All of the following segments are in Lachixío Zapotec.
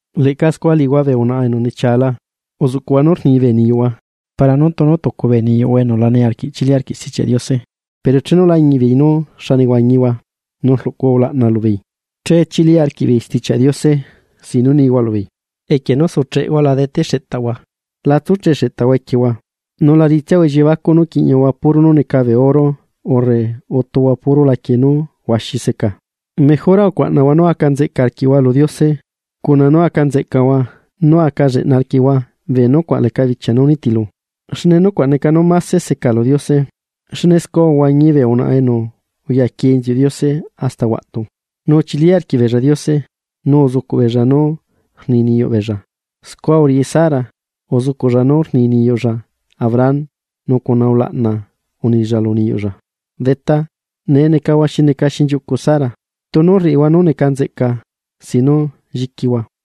Leꞌca scua liꞌihua bee unaꞌa enu nechiala, uzuꞌcuꞌhua nu rni bee niyuꞌhua para nú tunu tucu bee niyuꞌhua enu la niarquiꞌ chili arquiꞌ Stichiaꞌ Diose, pero chenu lañiꞌbeei nú xa nehuañihua, nu rluꞌcuhua ulaꞌna lubeei. Che chili arquiꞌbeei Stichiaꞌ Diose sin nu nihua lubeei. Equie nú sucheꞌhua la dete xeꞌtaꞌhua, la tsucheꞌ xeꞌtaꞌhua equiehua, nu la riꞌitsiahua elliebacuꞌ nú quiꞌñahua puro nú neca bee oro urre utuhua puro laquie nú huaxi seca. Mejora ucuaꞌnahua nú aca nzeꞌca arquiꞌhua lu Diose cuna nu aca nzeꞌcahua nu aca lleꞌna arquiꞌhua bee nucuaꞌ leca bichia nú nitilu, xne nucuaꞌ neca nú máse seca lu Diose. Xne scua uhuañi bee unaꞌa enu uyaquie inziuꞌ Diose hasta huaꞌtu, nu uchili arquiꞌbeella Diose nu uzucuꞌ beella nu rni niyuꞌ beella. Scua uriꞌi Sara, uzucuꞌlla nu rni niyuꞌlla Abraham nu cuna ulaꞌna unilla lu niyuꞌlla “Detá”. Nee necahua xi neca xinchiuꞌcu Sara, tunu rriꞌihua nú neca nzeꞌca sin nu lliquihua.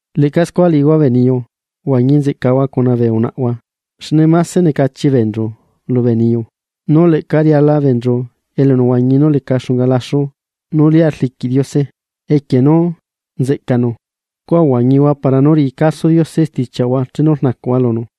Leꞌca scua liꞌihua bee niyu, uhuañi nzeꞌcahua cuna bee unaꞌhua. Xne mase necachi beenchu lubee niyu, nu leꞌca riala beenchu elunehuañi nú leca xunga laxu nú lia rliquiꞌ Diose equie nú nzeꞌcanu. Scua uhuañihua para nú riꞌi caso Diose stichiaꞌhua chenu rnacuꞌhua lunu.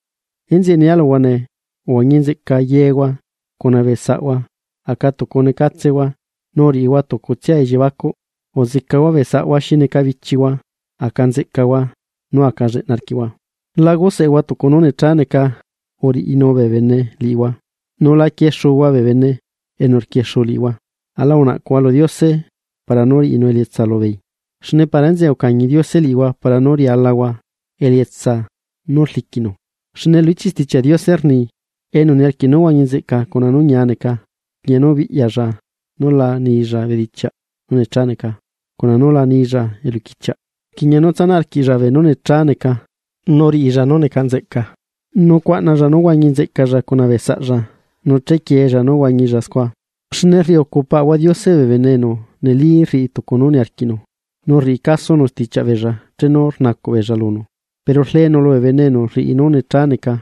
Enzeꞌe nia luhua nee, uhuañi nzeꞌca yehua cuna bee saꞌhua aca tucu necatsehua, nu uriꞌihua tucutsia elliebacuꞌ, uzecahua bee saꞌhua xi neca bichihua. Aca nzeꞌcahua nu aca lleꞌna arquiꞌhua. La guseꞌehua tucu nú necha neca uriꞌinu bee bene liꞌihua, nu la quiexuhua bee bene enu rquiexu liꞌihua. Aꞌla unacuꞌhua lu Diose para nú riꞌinu elietsa lubeei, xne para enzeꞌe ucañi Diose liꞌihua para nu rialahua elietsa nu rliquinu. Xne lu ichiꞌ Stichiaꞌ Diose rni: Enu niarquiꞌ nú huañi nzeꞌca cuna nu ñia neca, rquiꞌña nú biꞌyalla nú la nilla bedichiaꞌ nu necha neca cuna nú la nilla eluquichiaꞌ. Rquiꞌña nu tsanaꞌ arquiꞌlla beenú necha neca, nú riꞌilla nú neca nzeꞌca, nu cuaꞌnalla nú huañi nzeꞌcalla cuna bee saꞌlla nu chequieella nú huañilla scua. Xne rriucu Paꞌahua Diose bee bene enu neli rriꞌi tucu nú niarquiꞌnu, nu rriꞌi casonu stichiaꞌ beella chenu rnacuꞌ beella lunu, pero rleenu lubee bene enu rriꞌi nú necha neca.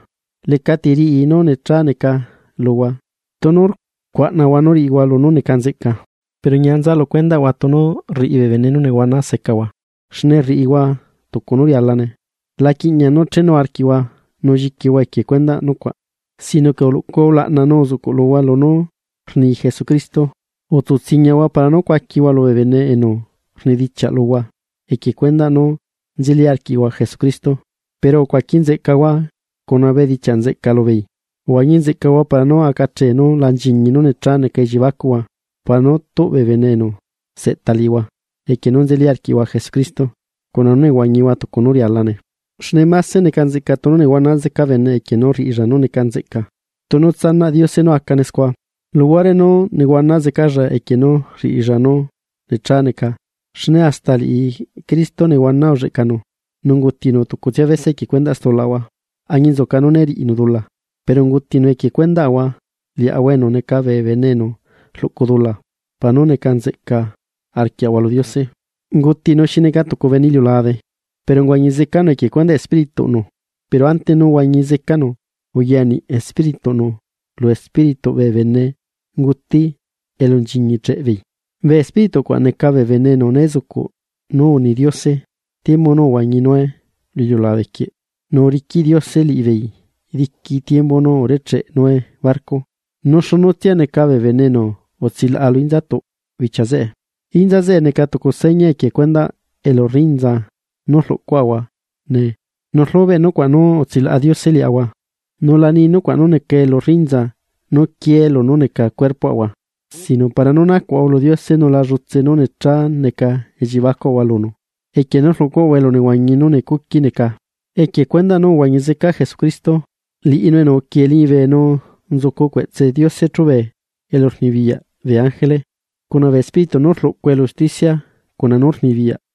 Lecati riꞌi nu necha neca luhua, tunu rcuaꞌnahua nú riꞌihua lunú neca nzeꞌca. Pero ñia nza lu cuendaꞌhua tunu rriꞌi bee bene nú nehuana secahua, xne rriꞌihua tucu nú rialane. La quiꞌña nú chenu arquiꞌhua nu lliquihua equie cuendaꞌ nucuaꞌ, sino que uluꞌcuhua ulaꞌna nu uzuꞌcuꞌluhua lunú rni Jesucristo. Utsutsiñahua para nú cuaquihua lubee bene enu rnidichiaꞌ luhua equie cuendaꞌ nú nzeli arquiꞌhua Jesucristo, pero ucuaqui nzeꞌcahua cuna bedichiaꞌ nzeꞌca lubeei. Uhuañi nzeꞌcahua para nu acahee nu la nchiñi nú necha neca elliebacuꞌhua para nú tuꞌ bee bene enu seꞌta liꞌihua equie nú nzeli arquiꞌhua Jesucristo, cuna nú nehuañihua tucu nu rialane. Xne máse neca nzeꞌca tunu nehuana zeca bene equie nú rriꞌilla nú neca nzeꞌca tunu tsanaꞌ Diose nu acane scua, luhuare nú nehuana zecalla equie nu rriꞌilla nú necha neca. Xne hasta liꞌi Cristo nehuana ulleꞌcanu, nu ungutinu tucutsia bese equie cuendaꞌ stulaꞌahua, añinzuca nú né riꞌinu dula, pero ungutinu equie cuendaꞌahua liaꞌahua enu neca bee bene enu rluꞌcu dula para nu neca nzeꞌca arquiaꞌahua lu Diose. Ungutinu xi neca tucu bene iliulabe, pero uhuañi zecanu equie cuendaꞌ Espírituꞌnu. Pero ante nú huañi zecanu, uyaniꞌ Espírituꞌnu lu espírituꞌ bee benenguti elu nchiñicheꞌbeei. Bee espíritu cuaꞌ neca bee bene enu né zucuꞌ nu uni Diose, tiembu nu uhuañi Noé lu iliulabe quieꞌ, nu uriquiꞌ Diose liꞌibeei diqui tiembu nu urecheꞌe Noé barco. Nu xunu tsia neca bee bene enu utsilaꞌa lu inza bichia zeꞌe. Inza zeꞌe neca tucu seña equie cuendaꞌ elu rrinza nú rlucuaꞌahua nee, nu rlubeꞌ nucuaꞌ nú utsilaꞌa Diose liaꞌahua. Nu la ni nucuaꞌ nu neca elu rrinza nú quiee lunú neca cuerpoꞌahua, sino para nu nacuaꞌahua lu Diose nu lá llutse nu necha neca elliebacuaꞌahua lunu, equie nu rluꞌcuaꞌahua elunehuañi nú necuqui neca, equie cuendaꞌ nú uhuañi zeca Jesucristo. Liꞌinu enu uquie liñibe nu nzucunu cueꞌtse Diose chubee elurnibiyaꞌ bee ángele, cuna bee espíritu nu rluꞌcu elu usticia cuna nú rnibiyaꞌ.